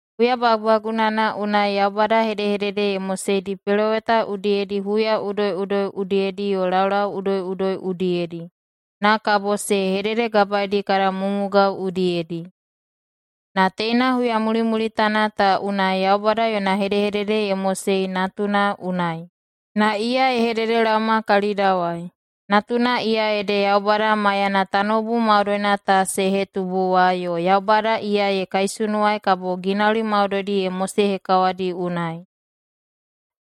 Huya bagubagunana unai Yaubada hedehedede ye moseidi peloweta udiyedi huya udoiꞌudoi udiyedi yo laulau udoiꞌudoi udiyedi, na kabo se hededegabaedi kada mumugao udiyedi. Na teina huya mulimulitana ta unai Yaubada yona hedehedede ye mosei Natuna unai, na iya ye hededelaoma kalidawai. Natuna iya ede Yaubada maiyana tanoubu maudoina ta se hetubu wa, yo Yaubada iya ye kaisunuwai kabo ginauli maudoidi ye mosehekawadi unai.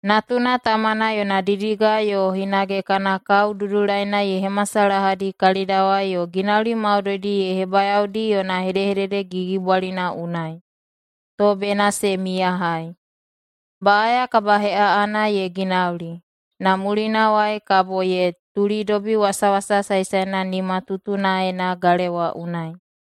Natuna Tamana yona didiga yo hinage kana kao dudulaina ye hemasalahadi kalidawai yo ginauli maudoidi ye hebayaodi yona hedehedede gigibwalina unai, to bena se miyahai. Baꞌaya kabaheꞌaꞌana ye ginauli, na mulinawai kabo ye tulidobi Wasawasa Saesaena nimatutunaena galewa unai.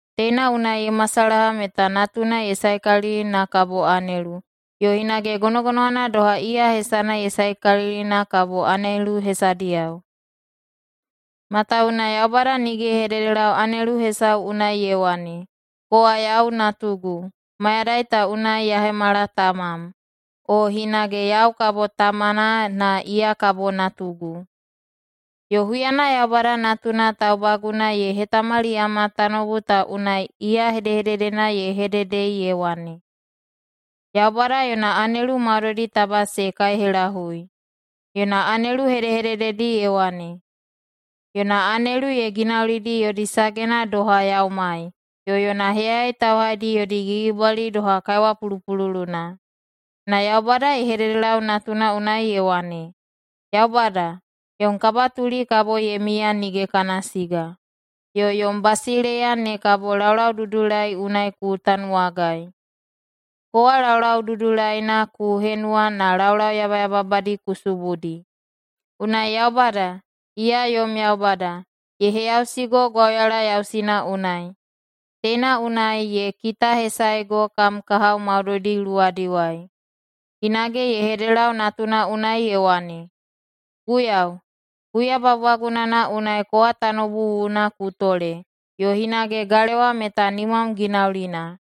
Teina unai ye masalaha meta Natuna ye saekalili na kabo anelu, yo hinage gonogonowana doha iya hesana ye saekalili na kabo anelu hesadiyao. Matawuwuna Yaubada nige ye hededelau anelu hesau unai ye wane, “Kowa yau natugu, mayadai ta unai ya hemala tamam.” o hinage, “Yau kabo tamana na iya kabo natugu.” Yo huyana Yaubada Natuna taubaguna ye hetamaliyama tanoubu ta unai, iya hedehededena ye hedehededei ye wane, “Yaubada yona anelu maudoidi taba se kaihelahui.” Yona anelu hedehedededi ye wane, “Yona anelu ye ginaulidi [yodi sagena] doha yaumai, yo yona heyayai tauhaidi [yodi gigibwali] doha kaiwa pulupululuna.” Na Yaubada ye hededelau Natuna unai ye wane, “Yaubada, yom kabatuli kabo ye miya nige kana siga, yo yom basileiya ne kabo laulaududulai unai ku tanuwagai. Kowa laulau dudulaina ku henuwa na laulau yabayababadi ku subudi. Unai Yaubada, iya yom Yaubada, ye heyausigo gwauyala yausina unai. Teina unai ye kitahesaego kam kahao maudoidi luwadiwai.” Hinage [ye hededelau Natuna unai ye wane], “Guiyau, huya bagubagunana unai kowa tanoubu wuwuna ku tole yo hinage galewa meta nimam ginaulina.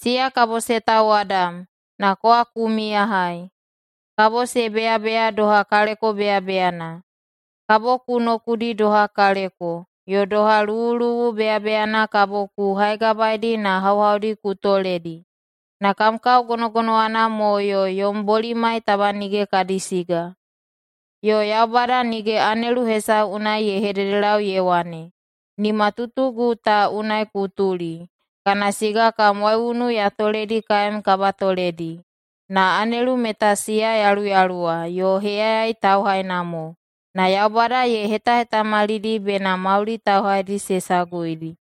Siya kabo se tauwadam, na kowa ku miyahai. Kabo se beyabeya doha kaleko beyabeyana. Kabo ku nokudi doha kaleko, yo doha luwuluwu beyabeyana kabo ku haigabaedi na hauhaudi ku toledi. Na kam kao gonogonowana mo yo yom bolimai taba nige kadi siga.” Yo Yaubada nige anelu hesau unai ye hededelau ye wane, “Nimatutugu ta unai ku tuli, kana siga kam waiunu ya toledi kaem kabatoledi.” Na anelu meta siya yaluyaluwa yo heyayai tauhaina mo, na Yaubada ye hetahetamalidi bena mauli tauhaidi se saguidi.